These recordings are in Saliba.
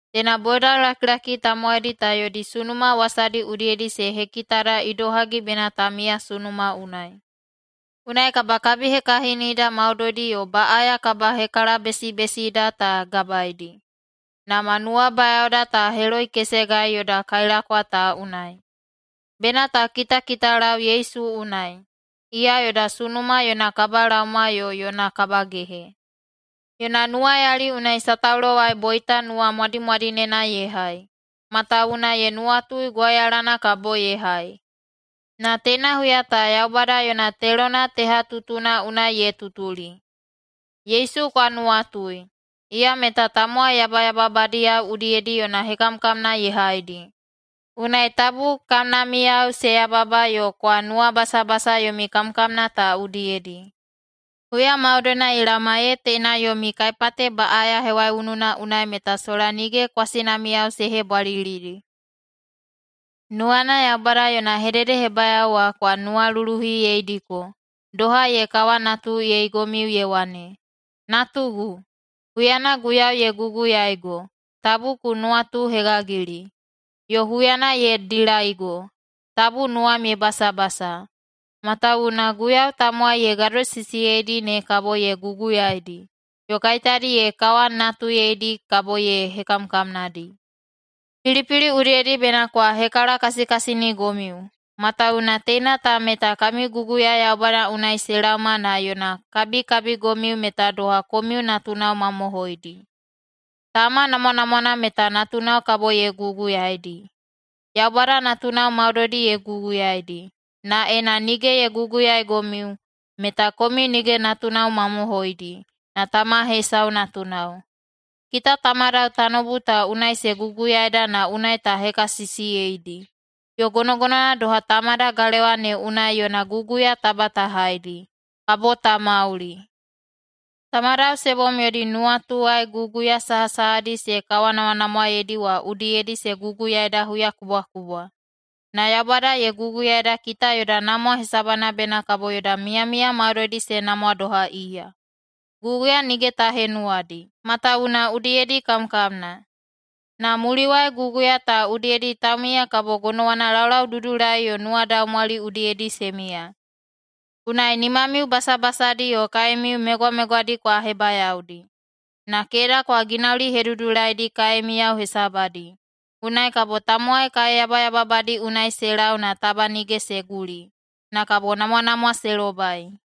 Teina bodalakilaki tamowaidi ta yodi sunuma wasadi udiyedi se hekitada idohagi bena ta miya sunuma unai. Unai kabakabihekahinida maudoidi yo baꞌaya kabahekalabesibesida ta gabaedi, na ma nuwabayaoda ta heloikesegai yoda kailakwa ta unai. Bena ta kitakitalau Yesu unai. Iya yoda sunuma yona kabalaoma yo yona kabagehe. Yona nuwayali unai sataulowai boita nuwamwadimwadinena ye hai, matawuwuna ye nuwatui gwauyalana kabo ye hai. Na teina huya ta Yaubada yona telona tehatutuna unai ye tutuli. Yesu kwa nuwatui! Iya meta tamowai yabayababadiyao udiyedi yona hekamkamna ye haidi. Unai tabu kamnamiyao se yababa yo kwa nuwabasabasa yomi kamkamna ta udiyedi. Huya maudoina ye laoma ee teina yomi kaipate baꞌaya hewaiununa unai meta sola nige kwasinamiyao se hebwalilidi. Nuwana Yaubada yona hededehebayao wa kwa nuwaluluhiyeidiko, doha ye kawanatuyeigomiu ye wane, “Natugu, huyana Guiyau ye guguyaigo, tabu ku nuwatuhegagili, yo huyana ye dilaigo, tabu nuwam ye basabasa, matawuwuna Guiyau tamowai ye gadosisiyeidi ne kabo ye guguyaidi, yo kaiteyadi ye kawanatuyedi kabo ye hekamkamnadi.” Pilipili udiyedi bena kwa hekalakasikasinigomiu, matawuwuna teina ta meta kami guguya Yaubada unai se laoma na yona kabikabigomiu meta doha komiu natunao mamohoidi. Tama namwanamwana meta natunao kabo ye guguyaidi. Yaubada natunao maudoidi ye guguyaidi, na ena nige ye guguyaigomiu, meta komiu nige natunao mamohoidi, na tama hesau natunao. Kita tamadao tanoubu ta unai se guguyaida na unai ta hekasisiyeidi. Yo gonogonowana doha Tamada galewa ne unai yona guguya taba ta haidi, kabo ta mauli. Tamadao se bom yodi nuwatuwai guguya sahasahadi se kawanamwanamwaedi wa udiyedi se guguyaida huyakubwakubwa, na Yaubada ye guguyaida kita yoda namwa hesabana bena kabo yoda miyamiya maudoidi se namwa doha iya. Guguya nige ta henuwadi, matawuwuna udiyedi kamkamna. Na muliwai guguya ta udiyedi taumiya kabo gonowana laulaududulai yo nuwadaumwali udiyedi se miya. Unai nimamiu basabasadi yo kaemiu megwamegwadi kwa hebayaodi. Na keda kwa ginaulihedudulaidi kaemiyao hesabadi. Unai kabo tamowai kaeyabayababadi unai se lau na taba nige se guli, na kabo namwanamwa se lobai.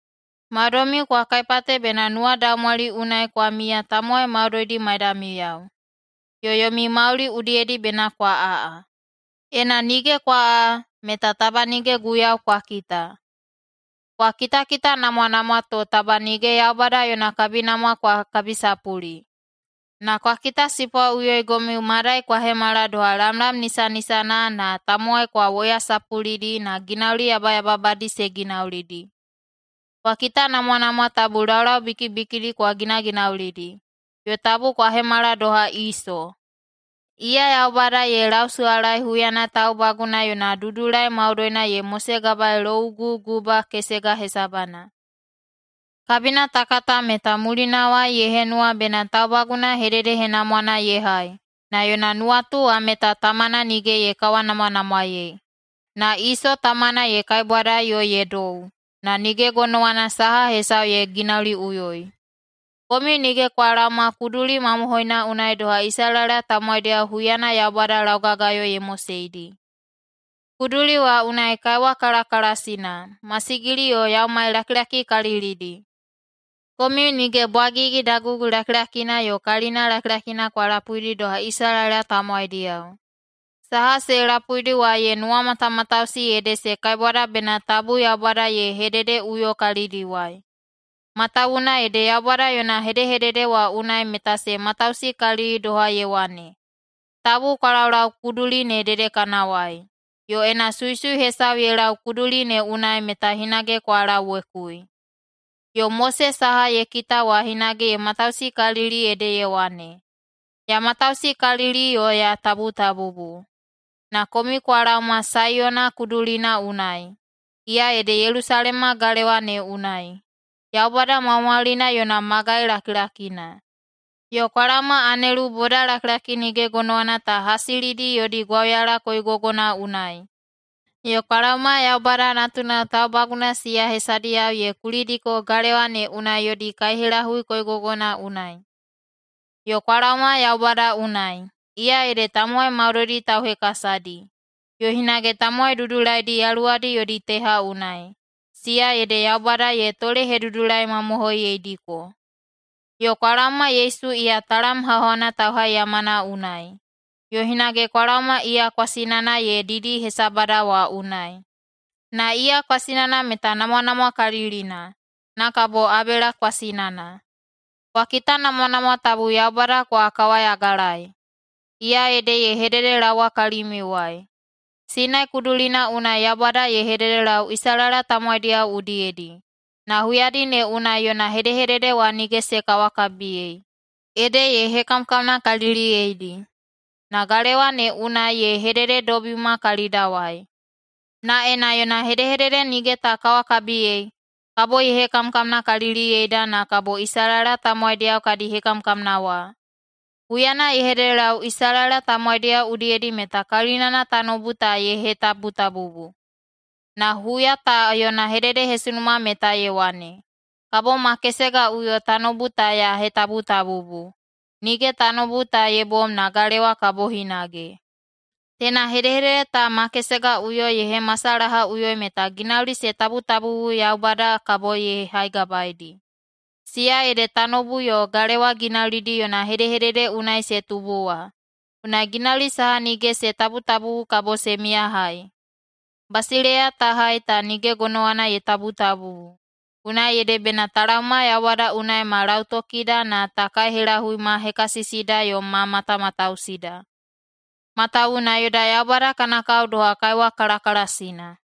Maudoimiu kwa kaipate bena nuwadaumwali unai kwa miya tamowai maudoidi maidamiyao, yo yomi mauli udiyedi bena kwa aꞌa. Ena nige kwa aꞌa, meta taba nige Guiyau kwa kita. Kwa kitakitanamwanamwa to taba nige Yaubada yona kabinamwa kwa kabisapuli. Na kwa kitasipwaꞌuyoigomiu madai kwa hemala doha lamlam nisanisana na tamowai kwa woyasapulidi na ginauli yabayababadi se ginaulidi. Kwa kitanamwanamwa tabu laulau bikibikidi kwa ginaginaulidi, yo tabu kwa hemala doha Iso. Iya Yaubada ye lausuwalaei huyana taubaguna yona dudulai maudoina ye mosegabaei louguguba kesega hesabana. Kabina ta kata meta mulinawai ye henuwa bena taubaguna hededehenamwana ye hai, na yona nuwatu wa meta tamana nige ye kawanamwanamwaei. Na Iso tamana ye kaibwadai yo ye dou, na nige gonowana saha hesau ye ginauliꞌuyoi. Komiu nige kwa laoma kuduli mamohoina unai doha Isalaela tamowaidiyao huyana Yaubada laugagayo ye moseidi. Kuduli wa unai kaiwa kalakalasina, masigili yo yaumai lakilakikalilidi. Komiu nige bwagigi dagugulakilakina yo kalina lakilakina kwa lapuidi doha Isalaela tamowaidiyao. Saha se lapuidi wa ye nuwamatamatausi ede se kaibwada bena tabu Yaubada ye hedehededeꞌuyo kalidiwai. Matawuwuna ede Yaubada yona hedehedede wa unai meta se matausikalili doha ye wane, “Tabu kwa laulau kuduli ne dedekanawai, yo ena suisui hesau ye lau kuduli ne unai meta hinage kwa lauwekui.” Yo Mose saha ye kita wa hinage ye matausikalili ede ye wane, “Ya matausikalili yo ya tabutabubu.” Na komiu kwa laoma Saiyona Kudulina unai, iya ede Yelusalema galewa ne unai, Yaubada Maumaulina yona magai lakilakina. Yo kwa laoma anelu bodalakilaki nige gonowana ta hasilidi yodi gwauyala koigogona unai, yo kwa laoma Yaubada natunao taubaguna siya hesadiyao ye kulidiko galewa ne unai yodi kaihelahui koigogona unai. Yo kwa laoma Yaubada unai, iya ede tamowai maudoidi tauhekasadi, yo hinage tamowai dudulaidi yaluwadi yodi teha unai, siya ede Yaubada ye tolehedudulaimamohoiyeidiko. Yo kwa laoma Yesu iya talam hauhauna tauhaiyamana unai, yo hinage kwa laoma iya kwasinana ye didi hesabada wa unai. Na iya kwasinana meta namwanamwakalilina, na kabo Abela kwasinana. Kwa kitanamwanamwa tabu Yaubada kwa kawayagalaei. Iya ede ye hededelaowa kalimiuwai. Sinai kudulina unai Yaubada ye hededelau Isalaela tamowaidiyao udiyedi, na huyadi ne unai yona hedehedede wa nige se kawakabiyei, ede ye hekamkamnakaliliyeidi. Na galewa ne unai ye hedededobima kalidawai. Na ena yona hedehedede nige ta kawakabiyei, kabo ye hekamkamnakaliliyeda na kabo Isalaela tamowaidiyao kadi hekamkamna wa. Huyana ye hededelau Isalaela tamowaidiyao udiyedi meta kalinana tanoubu ta ye hetabutabubu. Na huya ta yona hededehesunuma meta ye wane, “Kabo ma kesegaꞌuyo tanoubu ta ya hetabutabubu, nige tanoubu ta ye bom na galewa kabo hinage.” Teina hedehedede ta “ma kesegaꞌuyo” ye hemasalahaꞌuyoi meta ginauli se tabutabubu, Yaubada kabo ye haigabaedi, siya ede tanoubu yo galewa ginaulidi yona hedehedede unai se tubu wa. Unai ginauli saha nige se tabutabubu kabo se miyahai. Basileiya ta hai ta nige gonowana ye tabutabubu, unai ede bena ta laoma Yaubada unai ma lautokida na ta kaihelahui ma hekasisida yo ma matamatausida, matawuwuna yoda Yaubada kana kao doha kaiwa kalakalasina.